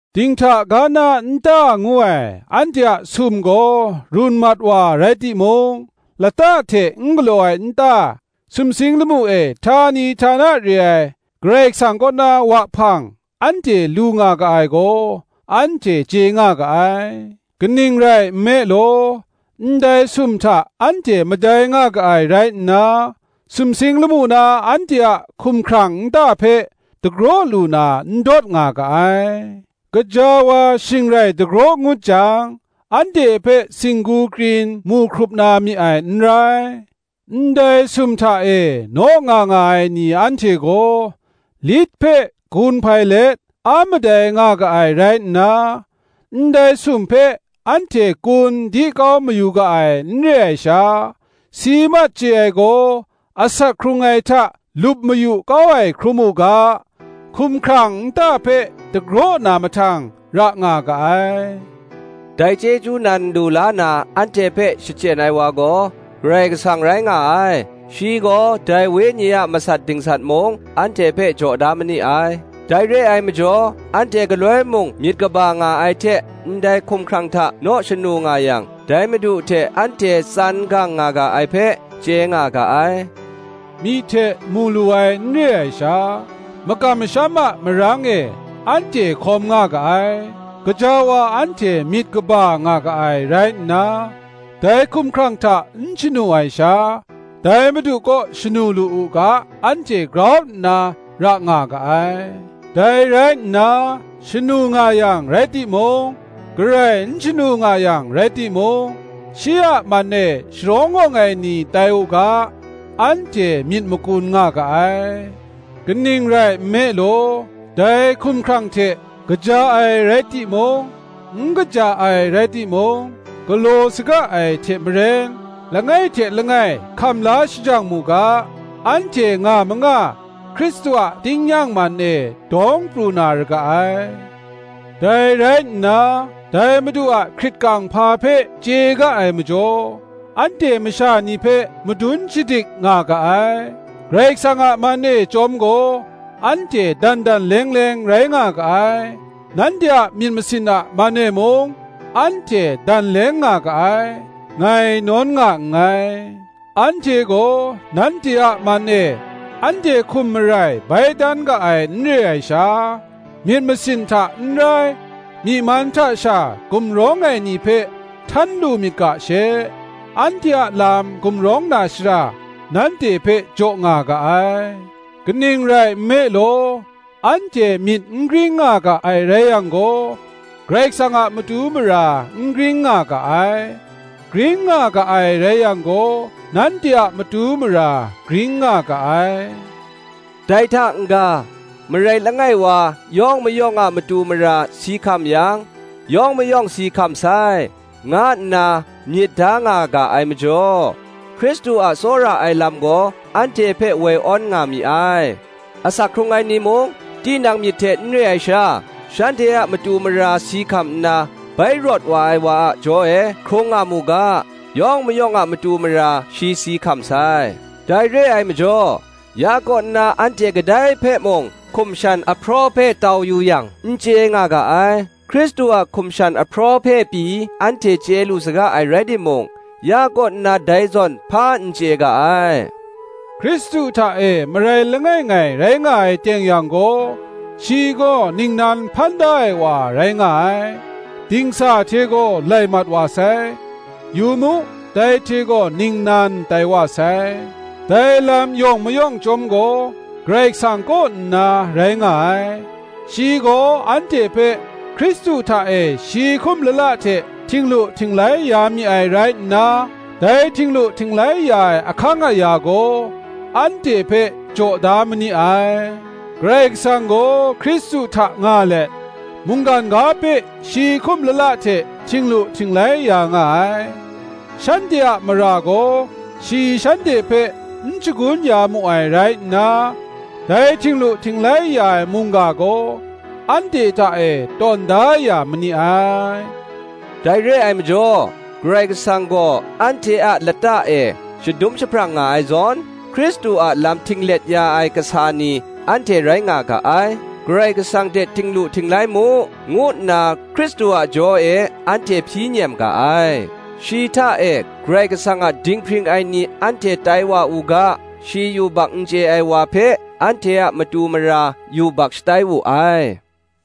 Dinghta ga na nta ngu ai anhte a sum gaw run mat wa rai timung, lata hte n galaw ai nta, sumsing lamu e htani htana re ai Karai Kasang kaw na wahpang anhte lu nga ga ai gaw, anhte chye nga ga ai. Kaning rai nme law, ndai sum hta anhte madai nga ga ai rai nna, sumsing lamu na anhte a hkumhkrang nta hpe, dagraw lu na ndawt nga ga ai; gaja wa shing rai dagraw ngut jang, anhte hpe singgu krin mu hkrup na mi ai n rai. Ndai sum hta e naw nga nga ai ni anhte gaw, lit hpe gun hpai let a madai nga ga ai rai nna, ndai sum hpe anhte kun di kau mayu ga ai n re ai sha, si mat chye ai gaw asak hkrung ai hta lup mayu kau ai hkrum u ga, hkumhkrang nta hpe dagraw na mahtang ra nga ga ai. Dai chyeju nan lu la na anhte hpe shachyen ai wa gaw, Karai Kasang rai nga ai; shi gaw dai Wenyi a masat dingsat mung, anhte hpe jaw da ma ni ai. Dai re ai majaw anhte galoi mung myit kaba nga ai hte ndai hkumhkrang hta naw shanu nga yang, dai Madu hte anhte tsan gang nga ga ai hpe, chye nga ga ai; myi hte mu lu ai n re ai sha, makam masham a marang e anhte hkawm nga ga ai; gaja wa anhte myit kaba nga ga ai rai nna, dai hkumhkrang hta n shanu ai sha, dai Madu kaw shanu lu u ga anhte grau nna ra nga ga ai. Dai rai nna, shanu nga yang rai timung, garai n shanu nga yang rai timung, shi a man e sharawng awng ai ni tai u ga, anhte myit makun nga ga ai. Kaning rai nme law, dai hkumhkrang hte kaja ai rai timung, n kaja ai rai timung, galaw saga ai hte maren, langai hte langai hkam la shajang mu ga, anhte nga manga Hkristu a tingnyang man e dawng pru na ra ga ai. Dai rai nna, dai Madu a hkrit kang hpa hpe chye ga ai majaw, anhte masha ni hpe madun shadik nga ga ai; Karai Kasang a man e chyawm gaw, anhte dan dan leng leng rai nga ga ai; nanhte a myit masin a man e mung, anhte dan leng nga ga ai, ngai nawn nga nngai. Anhte gaw nanhte a man e anhte hkum marai bai dan ga ai n re ai sha, myit masin hta n rai, myi man hta sha gumrawng ai ni hpe htan lu myit ga she, anhte a lam gumrawng na shara, nanhte hpe jaw nga ga ai. Kaning rai nme law, anhte myit n gring nga ga ai rai yang gaw, Karai Kasang a matu mara n gring nga ga ai; gring nga ga ai rai yang gaw, nanhte a matu mara gring nga ga ai. Dai hta n-ga, marai langai wa yawng mayawng a matu mara si hkam yang, yawng mayawng si hkam sai, nga nna myit da nga ga ai majaw, Hkristu a tsawra ai lam gaw anhte hpe woi awn nga mi ai: asak hkrung ai ni mung, tinang myit hte n re ai sha, shanhte a matu mara si hkam nna, bai rawt wa ai wa a jaw e hkrung nga mu ga, yawng mayawng a matu mara shi si hkam sai. Dai re ai majaw, ya kaw nna anhte kadai hpe mung hkum shan ahpraw hpe tau yu yang, n chye nga ga ai; Hkristu a hkum shan ahpraw hpe pyi anhte chye lu saga ai rai timung, ya kaw nna dai zawn hpa n chye ga ai. Hkristu hta e marai langai ngai rai nga ai teng yang gaw, shi gaw ningnan hpan da ai wa rai nga ai; dingsa hte gaw lai mat wa sai, yu mu, dai hte gaw ningnan tai wa sai. Dai lam yawng mayawng chyawm gaw Karai Kasang kaw nna rai nga ai; shi gaw anhte hpe Hkristu hta e shi hkum lala hte htinglu htinglai ya mi ai rai nna, dai htinglu htinglai ya ai ahkang aya gaw anhte hpe jaw da ma ni ai; Karai Kasang gaw Hkristu hta nga let, mungkan ga hpe shi hkum lala hte htinglu htinglai ya nga ai; shanhte a mara gaw shi shanhte hpe n shagun ya mu ai rai nna, dai htinglu htinglai ya ai mungga gaw anhte hta e tawn da ya ma ni ai. Dai re ai majaw Karai Kasang gaw anhte a lata e shadum jahprang nga ai zawn, Hkristu a lam htinglet ya ai kasa ni anhte rai nga ga ai; Karai Kasang hte htinglu htinglai mu, ngu nna Hkristu a jaw e anhte hpyi nem ga ai. Shi hta e Karai Kasang a dinghpring ai ni anhte tai wa u ga, shi yubak n chye ai wa hpe, anhte a matu mara yubak shatai wu ai.